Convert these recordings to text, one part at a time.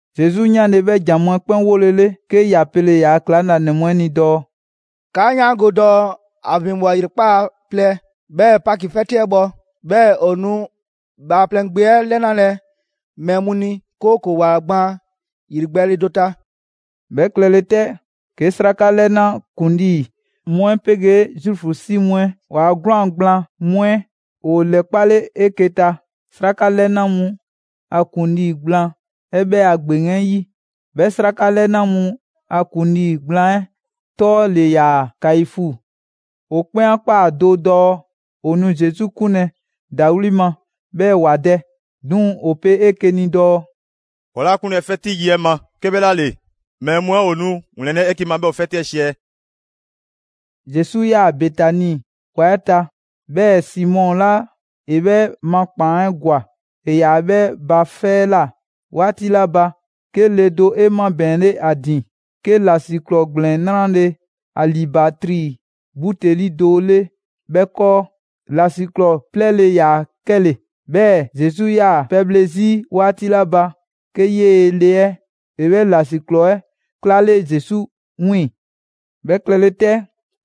Zesu 'yanle‑ 'bhɛ ‑jan mu 'ɛ 'kpɛn 'wolele, 'ke ‑ya pele‑ ‑yaa' ‑klaŋlanɛ mu 'ɛ ni dɔɔ: «'Kaa 'yaango‑ dɔɔ ‑a ‑vinbwa ‑yrekpaa' plɛ 'bhɛɛ‑ Paki 'fɛti yi 'ɛ bhɔ. 'Bhɛɛ‑ ‑o nu Bhaaplɛŋ Gbe 'ɛ 'lɛnalɛ mɛɛ mu ni, 'kooko‑ ‑wa gbaan ‑yrigbɛɛle do ta.» 'Bhɛ klɛle 'tɛ, 'ke 'sraka 'lɛna ‑kuŋlii mu 'ɛ 'pegee Zuufu 'si mu 'ɛ waa 'gwlaan‑ gblaan mu 'ɛ ‑woo ‑lɛkpale 'eke‑ ta 'sraka 'lɛna mu a ‑kuŋlii gblaan 'ɛ 'bhɛ a ‑gbeŋ 'ɛ 'yi: 'Bhɛ 'sraka 'lɛna mu a ‑kuŋlii gblaan 'ɛ 'tɔ ‑le ‑yaa Kaifu. ‑O 'kpɛn 'a ꞊kpaa do dɔɔ ‑o nu Zesu 'kunlɛ‑ ‑dawli' ma 'bhɛɛ‑ ‑wa dɛ. 'Duŋ‑ ‑o pe 'eke‑ ni dɔɔ: «'Kɔɔ‑ 'laa ‑a 'kunlɛ‑ 'fɛti yi 'ɛ ma, 'kebhlaale, mɛɛ mu 'ɛ ‑o nu 'wlɛnlɛ‑ 'eke‑ ma 'bhɛɛ‑ ‑o 'fɛti 'ɛ 'siɛ.» Zesu 'yaa‑ Betani ‑wa 'ɛ ta, 'bhɛɛ‑ Simɔ 'la ‑e 'bhɛ ma ‑kpaan 'ɛ ‑gwa, ‑e ‑yaa 'bhɛ ba 'fɛ 'ɛ ꞊la 'waati 'la ba, 'ke le do 'e 'mabɛɛnle 'a ‑din 'ke ‑lasiklɔɔ ‑gblɛn 'nrale‑ alibatri buteli do 'le 'bhɛ 'kɔɔ: ‑lasiklɔɔ 'plɛɛle‑ 'yaa‑ 'kɛle‑. 'Bhɛɛ‑ Zesu 'yaa‑ pɛbhle 'zi 'waati 'la ba, 'ke 'yee‑ le 'ɛ ‑e 'bhɛ ‑lasiklɔɔ 'ɛ 'klaale Zesu 'wiiŋ‑. 'Bhɛ klɛle 'tɛ,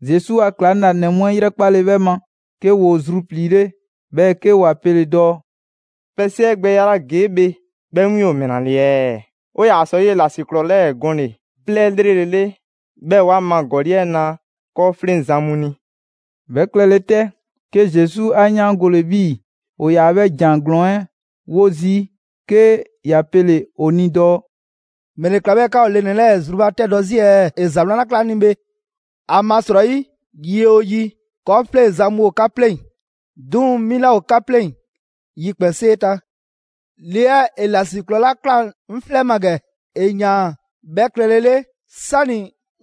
Zesu a ‑klaŋlanɛ mu 'ɛ 'yrɛkpale 'bhɛ ma, 'ke ‑woo zrupliile, 'bhɛɛ‑ 'ke ‑wa pele‑ dɔɔ: «Pɛ 'siɛgbɛya 'la ‑gee' bhe 'bhɛ win ‑o ‑mɛla ‑le ɛɛ? ‑O ‑yaa sɔ 'yee‑ ‑lasiklɔɔ 'lɛɛ‑ gɔnle‑ 'plɛɛ 'lrele‑ 'le, 'bhɛɛ‑ ‑wa ma ‑gɔli' 'ɛ na 'kɔɔfleŋzan mu ni!» 'Bhɛ klɛle 'tɛ, 'ke Zesu 'a 'yaangole 'bhii‑ ‑o ‑yaa 'bhɛ ‑jan ‑glɔɔn 'ɛ 'wo zii', 'ke ‑ya pele‑ ‑o ni dɔɔ: «‑Mɛle ꞊kla 'bhɛɛ‑ 'ka ‑o le ‑nɛ 'lɛɛ‑ 'ɛ zrubatɛdɔ zii' ɛɛ? ‑E ‑za 'wlan ‑la ꞊kla 'ŋ ni bhe. ‑Amasrɔyi yi 'oo yi, 'kɔɔfleŋzan mu ‑o 'ka 'pleŋ‑; 'duŋ‑ 'mi 'laa ‑o 'ka 'pleŋ‑ yikpɛnsee ta. Le 'ɛ ‑e ‑lasiklɔɔ 'la ꞊klaa 'ŋ 'flɛ ma ‑gɛ, ‑e ‑yaan 'bhɛ klɛle 'le 'sani‑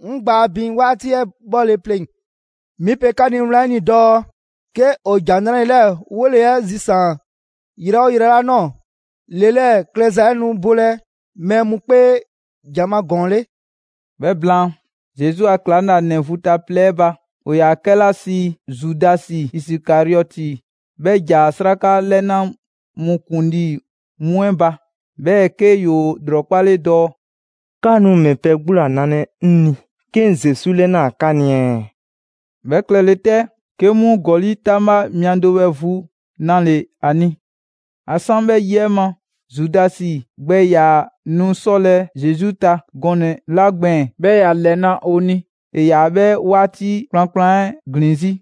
'ŋ gbaa bin 'waati 'ɛ 'bhɔle‑ pleŋ‑. 'Mi pe 'ka ni wlan 'ɛ ni dɔɔ 'ke ‑o ‑Jan 'Nrale‑ 'lɛɛ‑ 'wole‑ 'ɛ ꞊zian yrɛ 'oo 'yrɛ 'la ꞊nɔɔ, le 'lɛɛ‑ klɛza 'ɛ nu bolɛ mɛɛ mu 'kpee ‑jan ma ‑gɔɔn 'le.» 'Bhɛ blaan, Zesu a ‑klaŋlanɛ vu ta plɛ 'ɛ ba, ‑o ‑yaa ‑a 'kɛla sii Zudasi Isikariɔti, 'bhɛ ‑ja 'Sraka 'lɛna mu ‑kuŋlii mu 'ɛ ba, 'bhɛɛ‑ 'ke ‑yoo ‑lrɔkpale dɔɔ: «'Ka nu ‑mɛ pɛ 'gbu ‑la nalɛ 'ŋ ni 'ke 'ŋ Zesu 'lɛnaa‑ 'ka ni ɛɛ?» 'Bhɛ klɛle 'tɛ, 'ke 'mu ‑gɔli' 'taŋbha mia do 'bhɛ vu 'nale‑ ‑a ni. ‑A 'san 'bhɛ yi 'ɛ ma, Zudasi gbɛ ‑yaa nu 'sɔlɛ‑ Zesu ta gɔnɛ‑ 'la gbɛɛn‑, 'bhɛɛ‑ ‑ya ‑lɛna' ‑o ni, ‑e ‑yaa 'bhɛɛ‑ 'waati kplankplan 'ɛ ‑glin 'zi.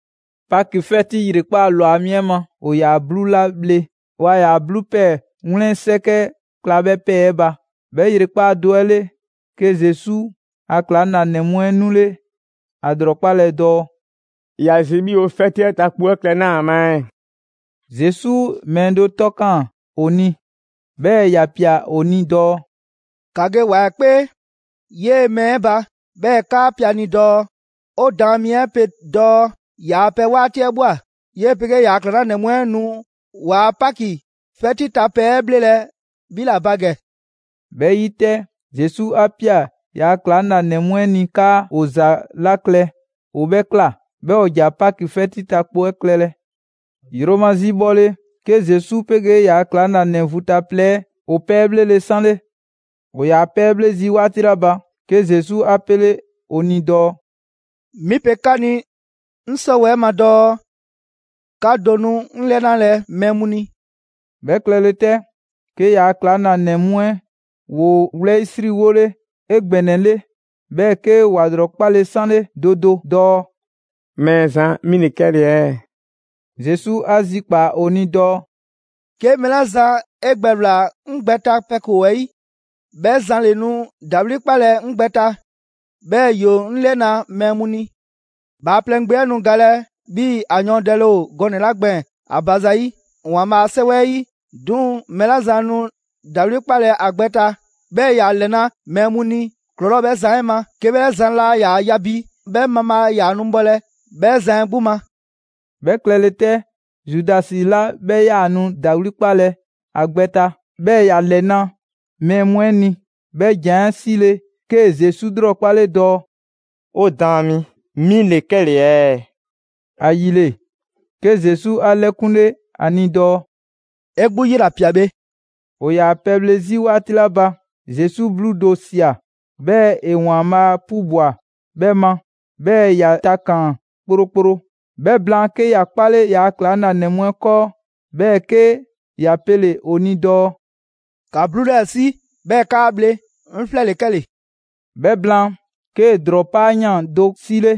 Paki 'fɛti 'ɛ 'yrekpaa‑ ‑lwa mi 'ɛ ma, ‑o ‑yaa 'bluu 'la bhle, waa ‑yaa 'bluu ‑pɛɛ 'wlɛn 'sɛkɛ kla 'bhɛ ‑pɛɛ 'ɛ ba. 'Bhɛ ‑yrekpaa' do 'ɛ 'le, 'ke Zesu a ‑klaŋlanɛ mu 'ɛ 'nule ‑a ‑lrɔkpalɛ dɔɔ: «꞊Ya zi 'bhii‑ 'o 'fɛti 'ɛ ta kpo 'ɛ klɛ 'naa‑ ma ɛɛ?» Zesu mɛɛ do 'tɔ ꞊kaan ‑o ni, 'bhɛɛ‑ ‑ya ꞊pia ‑o ni dɔɔ: «‑Ka ge ‑wa 'ɛ 'kpee 'yee‑ mɛɛ 'ɛ ba, 'bhɛɛ‑ 'kaa pe a ni dɔɔ: ‹'O Daan mi 'ɛ pe dɔɔ ‑yaa' pɛ 'waati 'ɛ ꞊bhwa, 'yee‑ 'pegee ‑yaa' ‑klaŋlanɛ mu 'ɛ nu ‑waa' Paki 'fɛti ta pɛ 'ɛ 'bhlelɛ‑ 'bhi ‑la ba ‑gɛ.›» 'Bhɛ yi 'tɛ, Zesu 'a ꞊pia ‑yaa' ‑klaŋlanɛ mu 'ɛ ni 'kaa ‑o ‑za 'la klɛ, ‑o 'bhɛɛ‑ ꞊kla. 'Bhɛɛ‑ ‑o ‑ja Paki 'fɛti ta kpo 'ɛ klɛlɛ. Yromazi bhɔle, 'ke Zesu 'pegee ‑yaa' ‑klaŋlanɛ vu ta plɛ 'ɛ, ‑o pɛ 'ɛ 'bhlele‑ 'sanle. ‑O ‑yaa pɛ 'ɛ 'bhle zii' 'waati 'la ba, 'ke Zesu 'a 'pele ‑o ni dɔɔ: «'Mi pe 'ka ni 'ŋ 'sɔwɛɛ‑ ma dɔɔ: 'Ka do nu 'ŋ 'lɛnalɛ mɛɛ mu ni.» 'Bhɛ klɛlɛ 'tɛ, 'ke ‑yaa' ‑klaŋlanɛ mu 'ɛ ‑woo wlɛyisriwole 'egbɛnɛle, 'bhɛɛ‑ 'ke ‑wa ‑lrɔkpale 'sanle do do dɔɔ: «Mɛɛzan, 'mi ‑le 'kɛle‑ ɛɛ?» Zesu 'a zikpaa‑ ‑o ni dɔɔ: «'Ke mɛɛ 'la zan 'e gbɛ ꞊wlaa 'ŋ gbɛ 'ɛ ta pɛ ‑koo 'ɛ 'yi, 'bhɛ zan ‑le nu ‑dawli' 'kpalɛ‑ 'ŋ gbɛ ta, 'bhɛɛ‑ ‑yoo 'ŋ 'lɛna‑ mɛɛ mu ni. Bhaaplɛŋ Gbe 'ɛ nu galɛ 'bhii‑ ‑a yɔɔndɛle ‑o gɔnɛ‑ 'la gbɛɛn‑ ‑a ba zayi' ‑Waanbhaa a 'Sɛwɛ 'ɛ 'yi. 'Duŋ‑ mɛɛ 'la zan nu ‑dawli' 'kpalɛ‑ ‑a gbɛ ta, 'bhɛɛ‑ ‑ya ‑lɛna' mɛɛ mu ni, ‑klɔlɔɔ' ‑o 'bhɛ zan 'ɛ ma. 'Ke 'bhɛ zan laa ‑yaa ya bi 'bhɛ mabhaa ‑yaa nu bhɔlɛ 'bhɛ zan 'ɛ 'gbu ma.» 'Bhɛ klɛle 'tɛ, Zudasi 'la 'bhɛ 'yaa‑ nu ‑dawli' 'kpalɛ‑ ‑a gbɛ ta, 'bhɛɛ ‑ya ‑lɛna' mɛɛ mu ni, 'bhɛ ‑jan 'ɛ 'sile‑ 'kee‑ Zesu 'lrɔkpale dɔɔ: «'O Daan mi, 'mi ‑le 'kɛle‑ ɛɛ?» ‑Ayile, 'ke Zesu 'a 'lɛkunle ‑a ni dɔɔ: «'E 'gbu 'yela‑ ꞊pia bhe.» ‑O ‑yaa pɛbhle 'zi 'waati 'la ba, Zesu 'bluu do ꞊sia, 'bhɛɛ‑ ‑e ‑Waanbhaa' 'pubwa‑ 'bhɛ ma, 'bhɛɛ‑ ‑ya takaan‑ kplokplo. 'Bhɛ blaan, 'ke ‑ya 'kpale ‑yaa' ‑klaŋlanɛ mu 'ɛ 'kɔɔ, 'bhɛɛ‑ 'ke ‑ya pele‑ ‑o ni dɔɔ: «‑Ka 'bluu 'lɛɛ‑ 'si 'bhɛɛ‑ ‑kaa bhle, 'ŋ 'flɛ ‑le 'kɛle‑.» 'Bhɛ blaan, 'kee‑ ‑drɔɔ 'paayan꞊ do 'sile,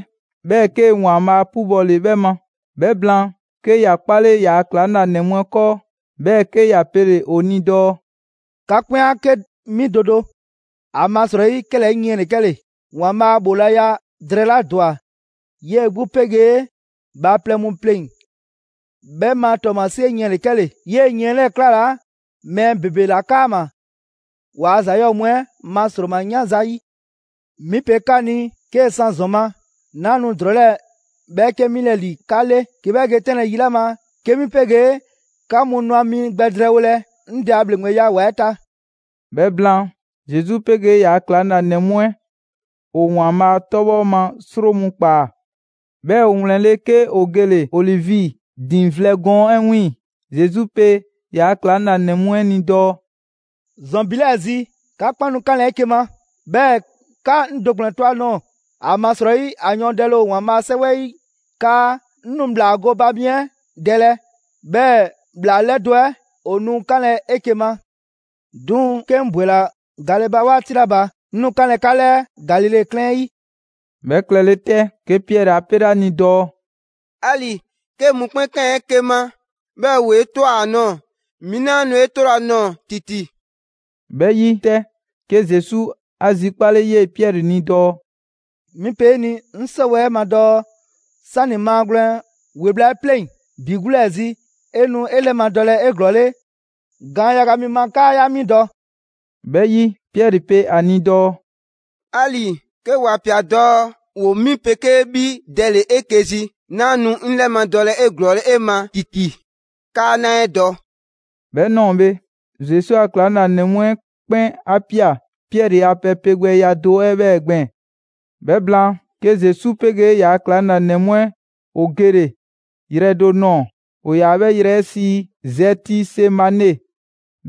'bhɛɛ‑ 'kee‑ ‑Waanbhaa' 'pubɔle 'bhɛ ma. 'Bhɛ blaan, 'ke ‑ya 'kpale ‑yaa' ‑klaŋlanɛ mu 'ɛ 'kɔɔ, 'bhɛɛ‑ 'ke ‑ya pele‑ ‑o ni dɔɔ: «'Ka 'kpɛn a 'ke 'mi do do. ‑Amasrɔyi, 'kɛlɛɛ‑ 'ŋ yiɛn ‑le 'kɛle‑, ‑Waanbhaa' ‑bhoolaya drɛɛ 'la ‑dwa 'yee‑ 'gbu 'pegee bhaaplɛŋ mu 'pleŋ‑ 'bhɛ ma ‑tɔɔmasie yiɛn ‑le 'kɛle‑. 'Yee‑ yiɛn 'lɛɛ‑ 'klalaa‑ mɛɛ ‑bebe ‑la 'kaama‑, ‑waa' ‑za 'yɔɔ‑ mu 'ɛ ma 'sroma‑ 'yan zayi'. 'Mi pe 'ka ni 'kee‑ 'san ‑zɔn ma, 'naa nu ‑drɔɔ 'lɛɛ‑ 'bhɛɛke 'milɛ‑ ‑li 'ka 'le, 'ke 'bhɛ ge 'tɛnlɛ‑ yi 'la ma 'ke 'mi 'pegee 'ka mu nu ‑a mi gbɛ drɛɛwolɛ 'ŋ Dɛ a ‑bhleŋgbeya ‑wa 'ɛ ta.» 'Bhɛ blaan, Zesu 'pegee ‑yaa' ‑klaŋlanɛ mu 'ɛ ‑o ‑Waanbhaa' 'tɔbhɔ ma 'sro mu ꞊kpaa, 'bhɛɛ‑ ‑o ‑wlɛnle', 'ke ‑o gele‑ Olivi diiŋ vlɛ gɔɔn 'ɛ 'wiiŋ‑. Zesu pe ‑yaa' ‑klaŋlanɛ mu 'ɛ ni dɔɔ: «‑Zɔn ‑bi 'lɛɛ‑ zi, 'ka 'kpɛn nu 'kanlɛ‑ 'eke‑ ma, 'bhɛɛ‑ 'ka 'ŋ do ‑kplɛn to ‑a ꞊nɔɔ. ‑Amasrɔyi, ‑a yɔɔndɛle ‑o ‑Waanbhaa' 'a 'Sɛwɛ 'yi 'kaa: ‹'Ŋ nu ‑bhlaa gooba mi 'ɛ dɛlɛ, 'bhɛɛ‑ ‑bhlaa 'lɛdo‑ 'ɛ ‑o nu 'kanlɛ‑ 'eke‑ ma.› 'Duŋ‑ 'ke 'ŋ ‑bwela gale ba 'waati 'la ba, 'ŋ nu 'kanlɛ‑ 'ka 'lɛɛ Galile 'klɛɛn 'ɛ 'yi.» 'Bhɛ klɛle 'tɛ, 'ke Piɛri 'a 'pele ‑a ni dɔɔ: «'Ali‑ 'ke mɔkpɛn' ꞊kaan 'eke‑ ma, 'bhɛɛ‑ ‑woo 'e ꞊twa ‑a nɔɔ‑, 'mi 'laa nu 'e 'tolɛ‑ ‑a nɔɔ‑ ‑titi.» 'Bhɛ 'yi 'tɛ, 'ke Zesu 'a zikpale 'yee Piɛri ni dɔɔ: «'Mi pe 'e ni 'ŋ 'sɔwɛɛ‑ ma dɔɔ: 'Sani‑ maagwlɛn ‑we bhla 'ɛ 'pleŋ‑ ‑bi 'gbu 'lɛɛ zi, 'e nu 'e 'lɛmadɔlɛ 'eglɔɔle gaan yaga 'mi ma 'kaa 'yaa 'mi dɔ.» 'Bhɛ 'yi, Piɛri pe ‑a ni dɔɔ: «'Ali‑ 'ke ‑wa ꞊pia dɔɔ ‑woo 'mi 'pegee 'bhi dɛle‑ 'eke‑ zi, 'naa nu 'ŋ 'lɛmadɔlɛ 'eglɔɔle 'e ma ‑titi 'kaa 'naa 'e dɔ.» 'Bhɛ 'nɔɔ‑ bhe, Zesu a ‑klaŋlanɛ mu 'ɛ 'kpɛn 'a ꞊pia Piɛri a pɛ pegbɛya do 'ɛ 'bhɛɛ‑ gbɛɛn‑. 'Bhɛ blaan, 'ke Zesu 'pegee ‑yaa' ‑klaŋlanɛ mu 'ɛ ‑o gele‑ yrɛ do nɔɔ‑, ‑o ‑yaa 'bhɛ yrɛ 'ɛ sii: Zɛtisemane.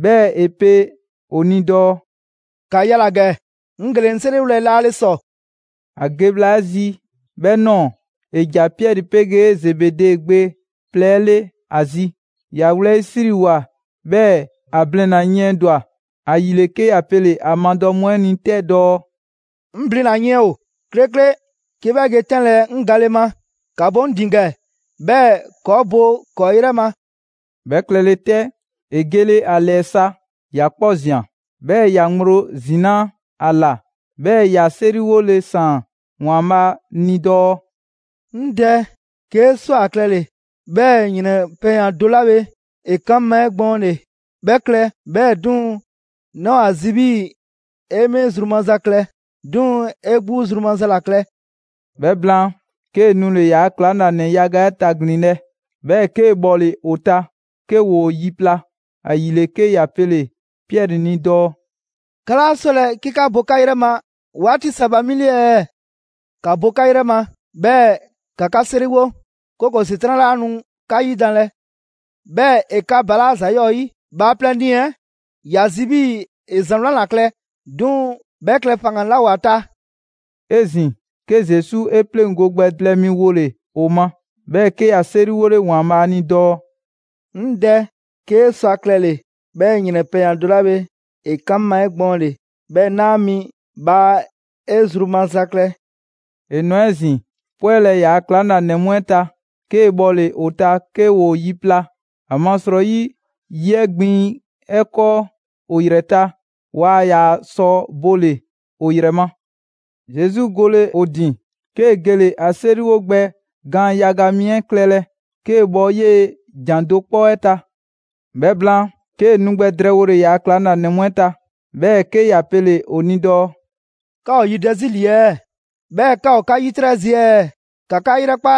'Bhɛɛ‑ ‑e pe ‑o ni dɔɔ: «‑Ka yala‑ ‑gɛ, 'ŋ gele‑ 'ŋ 'seriwolɛ laale ‑sɔ.» ‑A ge bhla 'ɛ zi 'bhɛ ꞊nɔɔ, ‑e ‑ja Piɛri 'pegee Zebede gbe plɛ 'ɛ 'le ‑a zi. ‑Ya wlɛyisriwoa, 'bhɛɛ‑ ‑a blina‑ yiɛndwa‑. ‑Ayile, 'ke ‑ya pele‑ ‑a madɔ mu 'ɛ ni 'tɛ dɔɔ: «'Ŋ 'blina‑ yiɛn ‑o 'klekle 'ke 'bhɛ ge 'tɛnlɛ‑ 'ŋ gale ma: ‑ka bo 'ŋ ‑din ‑gɛ 'bhɛɛ‑ ‑kɔɔ' bo ‑kɔɔ' 'yrɛ ma.» 'Bhɛ 'klɛle‑ 'tɛ, ‑e gele ‑a ‑lɛɛ sa, ‑ya 'kpɔ ꞊zian, 'bhɛɛ‑ ya ŋgblo zinaa' ‑a ‑la, 'bhɛɛ‑ ‑ya 'seriwole ꞊saan ‑Waanbhaa' ni dɔɔ: «'Ŋ Dɛ, 'kee‑ sɔ ‑a klɛle‑ 'bhɛɛ‑ ‑yrɛn pɛyan‑ do 'la bhe ‑e kan 'ŋ ma 'egbɔɔnle, 'bhɛ klɛ! 'Bhɛɛ‑ 'duŋ‑, 'naa ‑o ‑a zi 'bhii‑ 'e 'mi zru maza klɛ, 'duŋ‑ 'e 'gbu zru maza ‑la klɛ.» 'Bhɛ blaan, 'kee‑ nule‑ ‑yaa' ‑klaŋlanɛ yaga 'ɛ taglinlɛ, 'bhɛɛ‑ 'kee‑ bhɔle‑ ‑o ta 'ke ‑woo yi pla. ‑Ayile, 'ke ‑ya pele‑ Piɛri ni dɔɔ: «'Ka 'laa 'sɔlɛ‑ 'ke 'ka bo 'ka 'yrɛ ma 'waati sa ba 'mi 'le ɛɛ? ‑Ka bo 'ka 'yrɛ ma, 'bhɛɛ‑ ‑ka 'ka 'seriwo, 'kooko‑ ‑Setran' 'laa nu 'ka yidanlɛ, 'bhɛɛ‑ ‑e 'ka balaa' ‑za 'yɔɔ‑ 'yi. Bhaaplɛŋ nii‑ 'ɛ ‑ya zi 'bhii‑ ‑e ‑za 'wlan ‑la klɛ, 'duŋ‑ 'bhɛ klɛ faŋgan‑ 'laa ‑o ‑a ta.» 'Ezin‑, 'ke Zesu 'e 'pleŋgo‑ gbɛ plɛ mi wole‑ ‑o ma, 'bhɛɛ‑ 'ke ‑ya 'seriwole ‑Waanbhaa' ni dɔɔ: «'Ŋ Dɛ, 'kee‑ sɔ ‑a klɛle‑ 'bhɛɛ‑ ‑yrɛn pɛyan‑ do 'la bhe ‑e kan 'ŋ ma 'egbɔɔnle, 'bhɛɛ 'naa 'a mi! Bhaa 'e zru maza klɛ.» ‑E ‑nwa 'ezin‑ pwɛlɛ ‑yaa ‑klaŋlanɛ mu 'ɛ ta, 'kee‑ bhɔle‑ ‑o ta 'ke ‑woo yi pla; ‑amasrɔyi yi 'ɛ gbiŋ 'ɛ 'kɔɔ ‑o ‑yrɛ ta, waa ‑yaa sɔ bole‑ ‑o ‑yrɛ ma. Zesu gole ‑o ‑din, 'kee‑ gele ‑a 'seriwo gbɛ gaan yaga mi 'ɛ klɛlɛ 'kee‑ bɔ 'yee ‑jan do 'kpɔ 'ɛ ta. 'Bhɛ blaan, 'kee‑ nu gbɛ drɛɛwole ‑yaa ‑klaŋlanɛ mu 'ɛ ta, 'bhɛɛ‑ 'ke ‑ya pele‑ ‑o ni dɔɔ: «'Ka ‑o yidɛ 'zi ‑li ɛɛ, 'bhɛɛ‑ 'ka ‑o 'ka 'yitrɛ zi ɛɛ? ‑Ka 'ka 'yrɛkpa,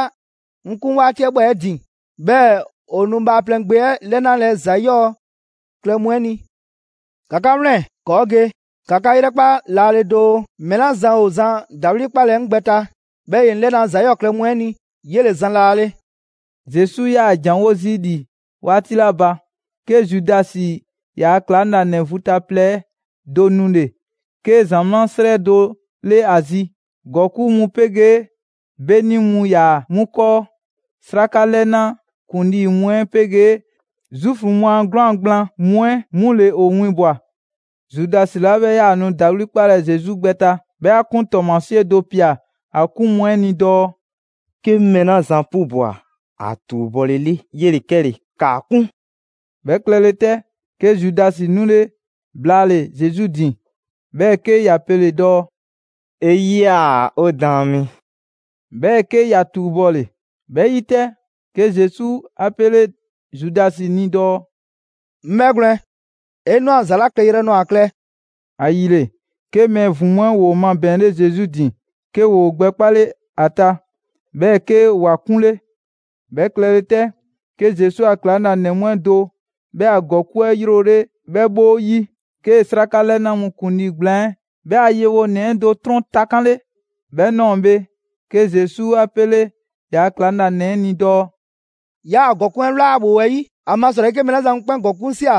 'ŋ 'kun 'waati 'ɛ ꞊bhwa 'e ‑din. 'Bhɛɛ‑ ‑o nu Bhaaplɛŋ Gbe 'ɛ 'lɛnalɛ ‑za 'yɔɔ‑ klɛ mu 'ɛ ni. ‑Ka 'ka 'wlɛn‑, ‑kɔɔ' ge! ‑Ka 'ka 'yrɛkpa laale doo, mɛɛ 'la zan ‑o zan ‑dawli' 'kpalɛ‑ 'ŋ gbɛ ta, 'bhɛɛ‑ ‑ye 'ŋ 'lɛna ‑za 'yɔɔ‑ klɛ mu 'ɛ ni, 'yele‑ zan laale.» Zesu 'yaa‑ ‑janwo' zii' ‑li 'waati 'la ba, 'ke Zudasi, ‑yaa' ‑klaŋlanɛ vu ta plɛ 'ɛ do nule‑ 'ke ‑zamaa' 'srɛ do 'le ‑a zi. ‑Gɔkuŋ' mu 'pegee 'beni mu ‑yaa 'mu 'kɔɔ. 'Sraka 'lɛna ‑kuŋlii mu 'ɛ 'pegee Zuufu mu a 'gwlaan‑ gblaan mu 'ɛ 'mu ‑le ‑o winbwa‑. Zudasi 'la 'bhɛ 'yaa‑ nu ‑dawli' 'kpalɛ‑ Zesu gbɛ ta, 'bhɛ 'a 'kun ‑tɔɔmasie do ‑pia ‑a 'kun mu 'ɛ ni dɔɔ: «'Ke 'ŋ mɛɛ 'la zan 'pubwa‑ ‑a ‑tuubɔlele, 'yele‑ 'kɛle‑. ‑Kaa 'kun.» 'Bhɛ klɛle 'tɛ, 'ke Zudasi 'nule blaale‑ Zesu ‑din, 'bhɛɛ‑ 'ke ‑ya pele‑ dɔɔ: «'E 'yia‑, 'o Daan mi!» 'Bhɛɛ‑ 'ke ‑ya ‑tuubɔle. 'Bhɛ 'yi 'tɛ, 'ke Zesu 'a 'pele Zudasi ni dɔɔ: «'Ŋ 'bhɛgwlɛn‑, 'e ꞊nwa ‑za 'la klɛyrɛ nɔɔ‑ ‑a klɛ.» ‑Ayile, 'ke mɛɛ ‑vin mu 'ɛ ‑woo mabɛɛnle Zesu ‑din, 'ke ‑woo gbɛkpale 'a ta, 'bhɛɛ‑ 'ke ‑wa 'kunle. 'Bhɛ klɛle 'tɛ, 'ke Zesu a ‑klaŋlanɛ mu 'ɛ do 'bhɛ a ‑gɔkuŋ' 'ɛ 'yrole 'bhɛ 'bhoo‑ 'yi, 'kee‑ 'sraka 'lɛna mu ‑kuŋlii gblaan 'ɛ 'bhɛ a yewonɛ 'ɛ do 'trɔn takanle. 'Bhɛ ꞊nɔɔ bhe, 'ke Zesu 'a 'pele ‑yaa' ‑klaŋlanɛ 'ɛ ni dɔɔ: «'Yaa‑ ‑gɔkuŋ' 'ɛ ꞊wla ‑a ‑bhoo 'ɛ 'yi, ‑amasrɔyi 'ke mɛɛ 'la zan mu 'kpɛn ‑gɔkuŋ' ꞊sia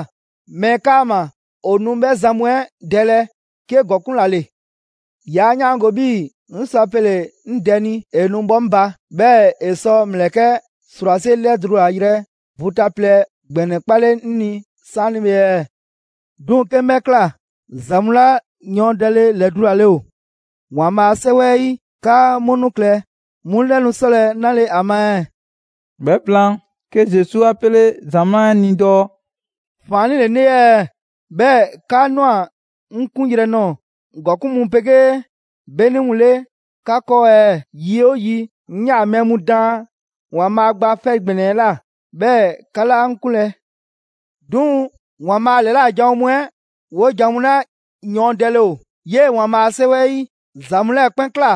mɛɛ 'kaama‑, ‑o nu 'bhɛ zan mu 'ɛ dɛlɛ 'ke ‑gɔkuŋ' ‑la ‑le. 'Yaa 'yaango‑ 'bhii‑ 'ŋ sɔ a pele‑ 'ŋ Dɛ ni ‑e nu 'bhɔ 'ŋ ba, 'bhɛɛ‑ ‑e sɔ ‑mlɛkɛ' ‑srwase' ‑lɛdulayrɛ vu ta plɛ ‑gbɛnɛ 'kpale 'ŋ ni 'saanibhe ɛɛ? 'Duŋ‑ 'ke 'ŋ 'bhɛ ꞊kla, ‑za mu 'la yɔɔndɛle ‑lɛdulale ‑o ‑Waanbhaa' a 'Sɛwɛ 'ɛ 'yi 'kaa 'mu nu klɛlɛ, 'mu 'lɛ nu 'sɔlɛ‑ 'nale‑ ‑a ma ɛɛ?» 'Bhɛ blaan, 'ke Zesu 'a 'pele ‑zamaa' 'ɛ ni dɔɔ: «‑Faannii' ‑le 'ŋ 'le ɛɛ 'bhɛɛ‑ 'ka ꞊nwa 'ŋ 'kunyrɛ‑ nɔɔ‑ ‑gɔkuŋ' mu 'pegee 'beni mu 'le 'ka 'kɔɔ ɛɛ? Yi 'oo yi, 'ŋ 'yaa‑ mɛɛ mu daan ‑Waanbhaa' Gba 'Fɛ ‑Gbɛnɛ 'ɛ ꞊la, 'bhɛɛ‑ 'ka 'laa 'ŋ 'kunlɛ‑. 'Duŋ‑ ‑Waanbhaa' ‑lɛla' janwo mu 'ɛ 'wojan‑ mu 'la yɔɔndɛle ‑o 'yee‑ ‑Waanbhaa' a 'Sɛwɛ 'ɛ 'yi, ‑za mu 'lɛɛ‑ 'kpɛn ꞊kla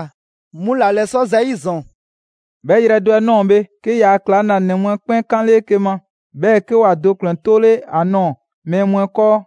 'mu ‑la ‑lɛsɔ' zayi' ‑zɔn.» 'Bhɛ yrɛ do 'ɛ ꞊nɔɔ bhe, 'ke ‑yaa' ‑klaŋlanɛ mu 'ɛ 'kpɛn 'kanle 'eke‑ ma, 'bhɛɛ‑ 'ke ‑wa do ‑kplɛn 'tole 'a nɔɔ‑ mɛɛ mu 'ɛ 'kɔɔ.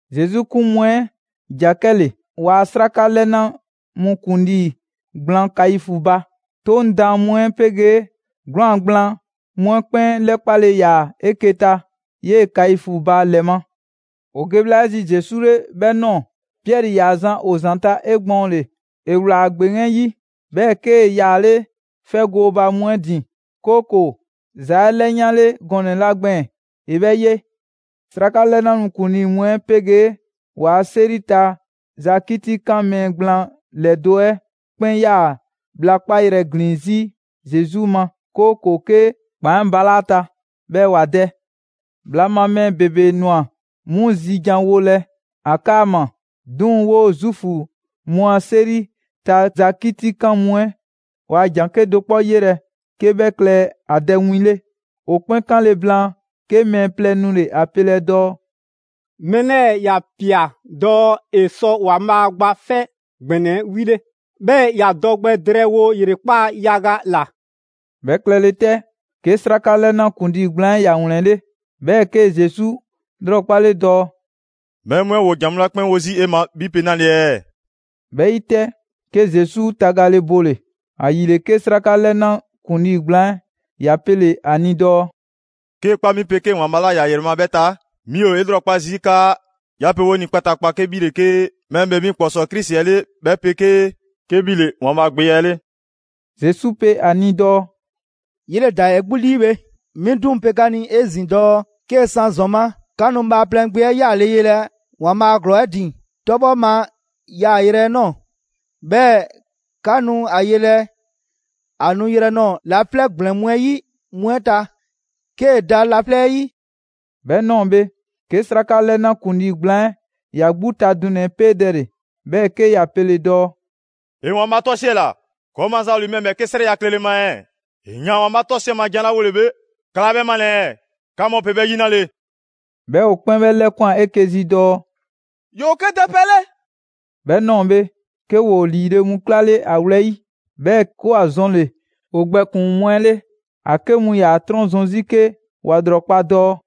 Zesu 'kun mu 'ɛ ‑ja 'kɛle‑ ‑waa' 'sraka 'lɛna mu ‑kuŋlii gblaan Kaifu ba. 'Toŋ daan mu 'ɛ 'pegee 'gwlaan‑ gblaan mu 'ɛ 'kpɛn 'lɛkpale ‑yaa 'eke‑ ta 'yee‑ Kaifu ba ‑lɛ ma. ‑O ge bhla 'ɛ zi Zesu 'le 'bhɛ ꞊nɔɔ, Piɛri ‑yaa zan ‑o ‑zanta' 'egbɔɔnle. ‑E ‑wlaa ‑gbeŋ 'ɛ 'yi, 'bhɛɛ‑ 'kee‑ yaale' 'fɛ gooba mu 'ɛ ‑din, 'kooko‑ ‑za 'ɛ 'lɛyanle gɔnɛ‑ 'la gbɛɛn‑ ‑e 'bhɛ ye. 'Sraka 'lɛna mu ‑kuŋlii mu 'ɛ 'pegee ‑waa' 'seri ta za 'kitikan mɛɛ gblaan ‑lɛdo' 'ɛ 'kpɛn 'yaa‑ bhla 'kpayrɛ‑ ‑glin 'zi Zesu ma, 'kooko‑ 'ke ‑kpan 'ɛ balaa' ‑a ta, 'bhɛɛ‑ ‑wa dɛ. Bhla ma mɛɛ ‑bebe ꞊nwa 'mu zijanwolɛ ‑a 'kaama‑, 'duŋ‑ 'woo‑ Zuufu mu a 'seri ta za 'kitikan mu 'ɛ waa ‑jan 'kedo‑ 'kpɔ 'yelɛ‑ 'ke 'bhɛ klɛ ‑a dɛ win 'le. ‑O 'kpɛn 'kanle‑ blaan, 'ke mɛɛ plɛ nule‑ ‑a pelɛ dɔɔ: «Mɛɛ 'lɛɛ‑ ‑ya ‑pia dɔɔ ‑e sɔ ‑Waanbhaa' Gba 'Fɛ ‑Gbɛnɛ 'ɛ 'wile‑ 'bhɛɛ‑ ‑ya dɔ gbɛ drɛɛwo ‑yrekpaa' yaga ‑la.» 'Bhɛ klɛle 'tɛ, 'ke 'sraka 'lɛna ‑kuŋlii gblaan 'ɛ ‑ya ‑wlɛnle', 'bhɛɛ‑ 'kee‑ Zesu 'lrɔkpale dɔɔ: «Mɛɛ mu 'ɛ ‑woo ‑jan mu 'la 'kpɛn 'wo zii' 'e ma 'bhi pe 'nale‑ ɛɛ?» 'Bhɛ 'yi 'tɛ, 'ke Zesu tagale bole‑. ‑Ayile, 'ke 'sraka 'lɛna ‑kuŋlii gblaan 'ɛ ‑ya pele‑ ‑a ni dɔɔ: «'Kee‑ kpa 'mi 'pegee ‑Waanbhaa' 'la ‑ya ‑yrɛ ma 'bhɛ ta, 'mi ‑o 'e 'lrɔkpa zii' 'kaa 'ya pe 'o ni kpataakpa 'ke 'bhi ‑le 'ke Mɛɛ ‑Bhee Mi ‑Kpɔsɔɔ Krisi 'ɛ 'le 'bhɛ 'pegee 'ke 'bhi ‑le ‑Waanbhaa' Gbe 'ɛ 'le.» Zesu pe ‑a ni dɔɔ: «'Yele‑ ꞊daa 'e 'gbu 'lii bhe. 'Mi 'duŋ‑ pe 'ka ni 'ezin‑ dɔɔ 'kee‑ 'san ‑zɔn ma, 'ka nu Bhaaplɛŋ Gbe 'ɛ 'yaale‑ yelɛ ‑Waanbhaa' ‑glɔɔ 'ɛ ‑din 'tɔbhɔ ma yaayrɛ 'ɛ ꞊nɔɔ. 'Bhɛɛ‑ 'ka nu ‑a yelɛ ‑a nuyrɛ nɔɔ‑ laflɛ' ‑gblɛn mu 'ɛ 'yi mu 'ɛ ta, 'kee‑ da laflɛ' 'yi.» 'Bhɛ ꞊nɔɔ bhe, 'ke 'sraka 'lɛna ‑kuŋlii gblaan 'ɛ ‑ya 'gbu ta dunɛ‑ 'ɛ 'peedɛle, 'bhɛɛ‑ 'ke ‑ya pele‑ dɔɔ: «‑E ‑Waanbhaa' 'tɔsiɛla! ‑Kɔɔ' maza ‑o ‑li mɛɛ ‑bhɛɛke' 'srɛya‑ klɛle ma ɛɛ? ‑E ‑yaan ‑Waanbhaa' 'tɔsiɛ ma jan 'la 'wolele bhe, 'ka 'laa 'bhɛ 'malɛ‑ ɛɛ? 'Ka mu pe 'bhɛ 'yi 'nale‑ ɛɛ?» 'Bhɛɛ‑ ‑o 'kpɛn 'bhɛ 'lɛkwan‑ 'eke‑ zi dɔɔ: «‑Yoo 'ke dɛ pɛ 'le.» 'Bhɛ ꞊nɔɔ bhe, 'ke ‑woo ‑liile' mu 'klale ‑a wlɛyi', 'bhɛɛ‑ 'ke ‑wa zɔnle‑ ‑o gbɛkpuŋ‑ mu 'ɛ 'le. ‑A 'ke mu ‑yaa ‑a 'trɔn zɔn 'zi 'ke ‑wa ‑lrɔkpa' dɔɔ: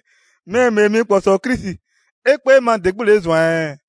«Mɛɛ ‑Bhee Mi ‑Kpɔsɔɔ Krisi, 'e 'kpee ma ‑de 'gbu ‑le 'e ꞊zwan ɛɛ?»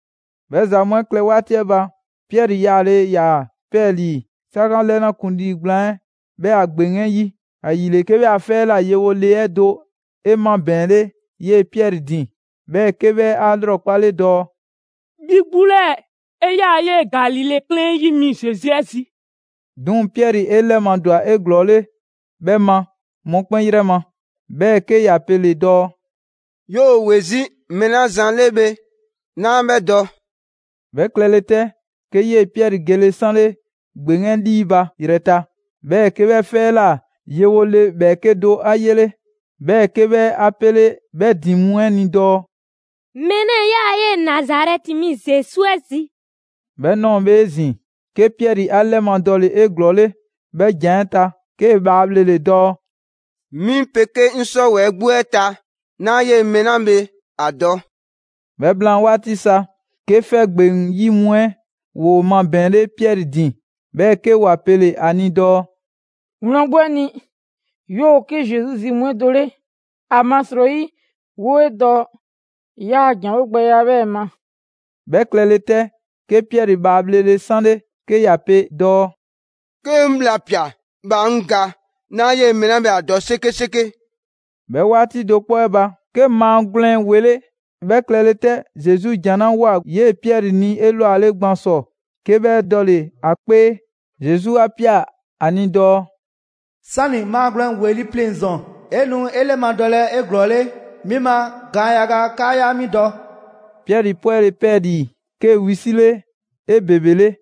'Bhɛ ‑za mu 'ɛ klɛ 'waati 'ɛ ba, Piɛri 'yaale‑ ‑yaa 'pɛɛlii‑ 'sraka 'lɛna ‑kuŋlii gblaan 'ɛ 'bhɛ a ‑gbeŋ 'ɛ 'yi. ‑Ayile, 'ke 'bhɛ a 'fɛ 'ɛ ꞊la yewo le 'ɛ do 'e 'mabɛɛnle 'yee‑ Piɛri ‑din, 'bhɛɛ‑ 'ke 'bhɛ 'a 'lrɔkpale dɔɔ: «'Bhi 'gbu 'lɛɛ‑, 'e 'yaa‑ 'yee‑ Galile 'klɛɛn 'ɛ 'yi mi Zesu 'ɛ zi.» 'Duŋ‑, Piɛri 'e 'lɛmadwa 'eglɔɔle 'bhɛ ma mɔkpɛn 'yrɛ ma, 'bhɛɛ‑ 'ke ‑ya pele‑ dɔɔ: «'Yoo‑ ‑we 'zi mɛɛ 'la zan 'le bhe, 'naa 'bhɛ dɔ.» 'Bhɛ klɛle 'tɛ, 'ke 'yee‑ Piɛri gele 'sanle ‑gbeŋ 'ɛ 'lii ba ‑yrɛta', 'bhɛɛ‑ 'ke 'bhɛ 'fɛ 'ɛ ꞊la yewo le ‑bhɛɛke' do 'a 'yele. 'Bhɛɛ‑ 'ke 'bhɛ 'a 'pele 'bhɛ ‑din mu 'ɛ ni dɔɔ: «Mɛɛ 'lɛɛ‑ 'yaa‑ 'yee‑ Nazarɛti mi Zesu 'ɛ zi.» 'Bhɛ ꞊nɔɔ bhe 'ezin‑, 'ke Piɛri 'a 'lɛmadɔle 'eglɔɔle 'bhɛ ‑jan 'ɛ ta, 'kee‑ bhaa bhlele‑ dɔɔ: «'Mi 'pegee 'ŋ 'sɔwɛɛ‑ 'gbu 'ɛ ta, 'naa 'yee‑ mɛɛ 'la bhe ‑a dɔ.» 'Bhɛ blaan 'waati sa, 'ke 'fɛ ‑gbeŋ 'yi mu 'ɛ ‑woo mabɛɛnle Piɛri ‑din, 'bhɛɛ‑ 'ke ‑wa pele‑ ‑a ni dɔɔ: «Wlan 'gbu 'ɛ ni, 'yoo‑ 'ke Zesu zi mu 'ɛ do 'le. ‑Amasrɔyi 'woo‑ 'e dɔ 'yaa‑ ‑janwo' gbɛya 'bhɛɛ‑ ma.» 'Bhɛ klɛle 'tɛ, 'ke Piɛri bhaa bhlele 'sanle, 'ke ‑ya pe dɔɔ: «'Ke 'ŋ bhla ꞊pia, bhaa 'ŋ ga. 'Naa 'yee‑ mɛɛ 'la bhe ‑a dɔ 'sekeseke!» 'Bhɛ 'waati do 'kpɔ 'ɛ ba, 'ke maagwlɛn ‑wele'. 'Bhɛ klɛle 'tɛ, Zesu ‑jan 'la ꞊woa 'yee‑ Piɛri ni 'elwale gban ‑sɔ, 'ke 'bhɛ dɔle‑ ‑a 'kpee, Zesu 'a ꞊pia ‑a ni dɔɔ: «'Sani‑ maagwlɛn ‑weli' pleŋ‑ ‑zɔn, 'e nu 'e 'lɛmadɔlɛ 'eglɔɔle 'mi ma gaan yaga 'kaa 'yaa 'mi dɔ.» Piɛri 'pwɛle‑ 'pɛɛlii‑, 'kee‑ wisile 'ebebele.